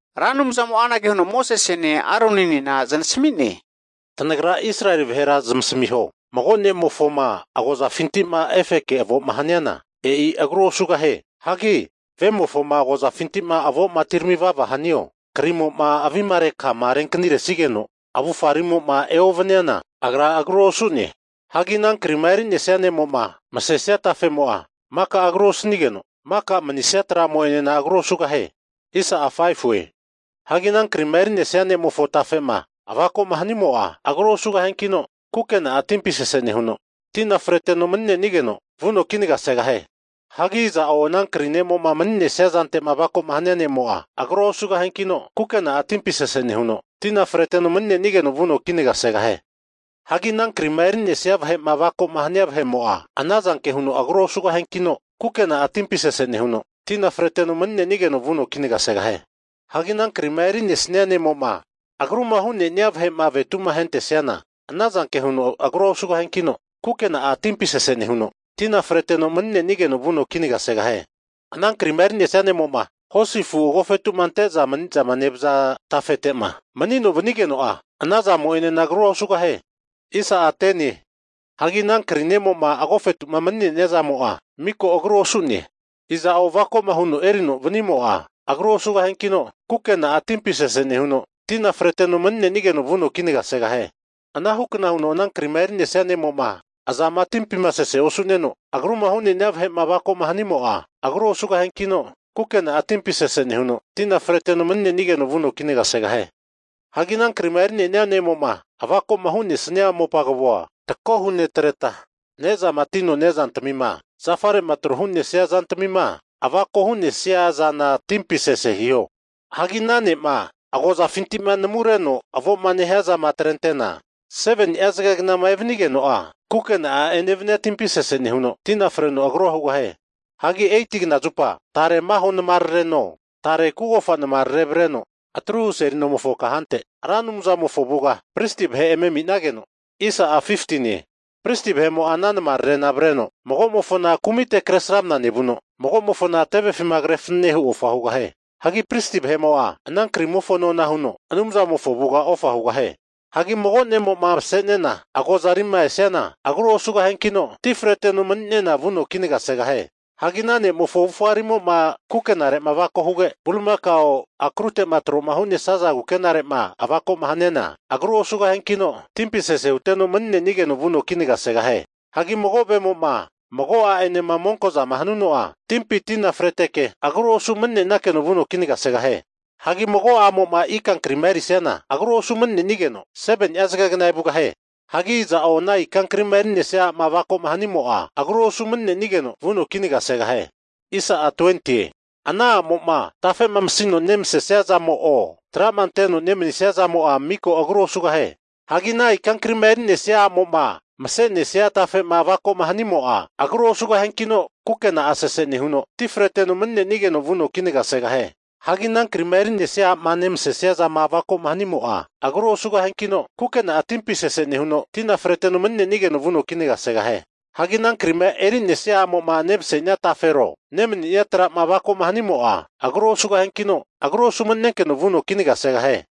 Ra Anumzamo'a anage huno Mosesene Aroninena znasami'ne, Tanagra Israeli vahera zamasamiho, mago ne'mofoma agozafinti'ma efeke avo'ma haniana, e'i agrua osugahie. Hagi vemofoma agozafinti avo'ma atirami vava hanio, avimarekama renkaniresigeno avufarima eovaniana, agra agru osu'ne. Hagi ana krima eri'nesia ne'mo'ma masesia tafemo'a maka agru osanigeno, maka manisia tra'mo'enena agrua osugahie. Hagi ana krima eri'nesia ne'mofo tafe'ma avako'ma hanimo'a, agrua osugahiankino, kukena'a timpi sese nehuno, tina freteno mani'nenigeno vuno kinagasegahie. Hagi iza'o ana kri ne'mo'ma mani'nesia zante'ma avako'ma hania vahe'mo'a, agrua osugahiankino kukena'a timpi sese nehuno, tina freteno mani'nenigeno vuno kinagasegahie. Hagi ana krima eri'nesia vahe'ma avako'ma hania vahe'mo'a, ana zanke huno agrua osugahiankino, kukena'a timpi sese nehuno, maninesigeno vuno kinaga segahie. Hagi ana krima eri'nesnia ne'mo'ma agruma hu'nenia vahe'ma avetu'ma ahentesiana, anazanke huno agrua osugahiankino, kukena'a timpi sese nehuno, tina freteno mani'nenigeno vuno kinagasegahie. Hagi ana krima eri'nesia ne'mo'ma hosi afu agofetu'ma ante'za manizama nevaza tafete'ma (satel) manino vanigeno'a, anazamo enena, agrua osugahie. Hagi ana kri ne'mo'ma agofetu'ma mani'nenia zantamimo'a miko agru osu'ne. Iza'o avako'ma huno erino vanimo'a, agrua osugahiankino, kukena'a timpi sese nehuno, tina freteno mani'nenigeno vuno kinagasegahie. Anahukna huno anankri'ma eri'nesia ne'mo'ma azama timpi sese osu'neno, agruma hu'nenia vahe'ma avakoma hanimo'a, agrua osugahiankino, kukena'a timpi sese nehuno, tina freteno mani'nenigeno vuno kinagasegahie. Hagi ana krima eri'nenia ne'mo'ma avako'ma hu'nesnia mopa kavoa takohu netreta, ne'zama atino ne'zantamima zafare'ma tro hu'nesia zantamima avako hu'nesia zana timpi sese hiho. Hagi ana ne'ma agozafintima namureno avo'ma nehiazama atrente'na, 7ni'a zagegnama evanigeno'a kukena'a enevania timpi sese nehuno, tina freno agrua hugahie. Hagi 8kna zupa tare maho namarareno, tare kugofa namarare avreno atruhu seli nomofo kahante Ra Anumzamofo avuga, pristi vahe eme aminageno, pristi vahe'mo'a ana namararena avreteno, magomofona kumite kresramna nevuno, mago'mofona tevefima kre fanane hu ofa hugahie. Hagi pristi vahe'mo'a ana krimofo nona huno Anumzamofo avuga ofa hugahie. Hagi mago ne'mo'ma mase'nena agozarima esiana agru osugahiankino, ti freteno mani'nena vuno kinagasegahie. Hagi ana ne'mofo avufga rimo'ma kukenare avako huge, bulimakao akruteti'ma tro hu'nesaza kukenare'ma avako'ma haniana, agrua osugahiankino, timpi sese huteno mani'nenigeno vuno kinagasegahie. Hagi mago vemo'ma mago a'enema monko'zama hanuno'a, timpi tina freteke agru osu mani'nenakeno vuno kinagasegahie. Hagi mago a'mo'ma ikankrima eri'siana agru osu mani'nenigeno 7ni'a zagegna evugahie. Hagi iza'o ana ika krima eri'nesia a'ma avako'ma hanimo'a, agru osu mani'nenigeno vuno kinagasegahie. Ana a'mo'ma tafe'ma masino nemasesia zamo'o, tra'ma anteno nemanisia miko zama'amo'a, agru osugahie. Hagi ana ikankrima erinesia a'mo'ma mase'nesia tafe'ma avako'ma hanimo'a, agru osugahiankino kukena'a sese nehuno, ti freteno mani'nenigeno vuno kinagasegahie. Hagi ana krima eri'nesia a'ma nemanisia zama avako'ma hanimo'a, agrua osugahiankino, kukena'a timpi sese nehuno, tina freteno mani'nenigeno vuno kinagasegahie. Hagi ana krima eri'nesia a'mo'ma nevasesia tafero, nemani'nea tra'ma avako'ma hanimo'a agru osugahiankino, agru osu mani'nenkeno vuno kinagasegahie.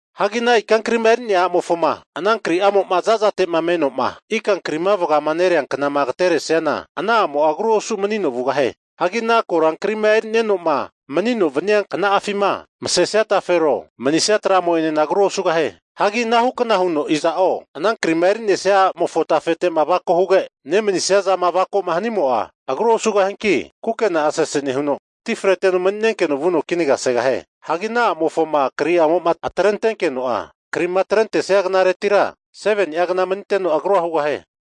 Hagi ana ikankrima eri'nea a'mofoma ana kri'amo'ma zazate'ma menoma ikankrima vagama nereanknama agateresiana, ana a'mo'a agrua osu manino vugahie. Hagi ana korankri'ma eri'nenoma manino vania kna'afima masesia tafero, manisia tra'mo'enena agru osugahie. Hagi anahukna huno iza'o, ana krima eri'nesia a'mofo tafe'ma avako huge, nemanisia zama avako'ma hanimo'a, agrua osugahianki kukena'a sese nehuno, ti freno mani'nenkeno vuno kinagasegahie. Hagi ana a'mofoma kri'amo'ma atrentenkeno'a, krima atrentenia knaretira 7ni'a gna maniteno agrua hugahie.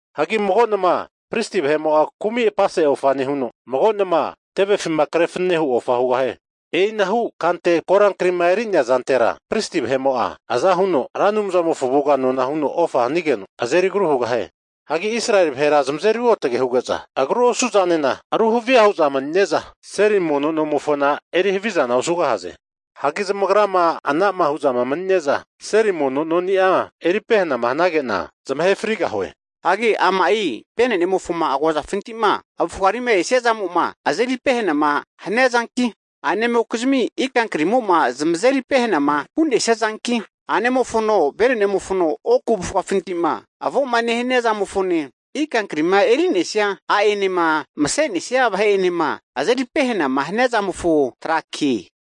Hagi mago nama pristi vahe'mo'a kumi' apase ofa nehuno, mago nama tevefima krefanane hu ofa hugahie. E'inahu kante korankrima e'rinea zantera pristi vahe'mo'a aza huno Ra Anumzamofo avuga nona huno ofa hanigeno, azeri agru hugahie. Hagi Israeli vahera zamazeri ruotage huge'za, agru osu zanena aru havia hu'za mani'ne'za seli mono nonimofona eri havizana osugahaze. Hagi zamagrama ana'ma hu'za mani'ne'za seli mono noni'a eri pehanama, hanage'na zamahe frigahue. Hagi ama'i venenemofoma agozafinti'ma avufga rima esia zamo'ma azeri pehana haniazanki, a'nemokizmi ikankrimo'ma zamazeri pehana hu'nesiazanki, a'nemofono venenemofono oku avufgafintima avoma nehania zamofone, ikankrima eri'nesia a'enema mase'nesia vahe'enema azeri pehanama hania zamofo trake.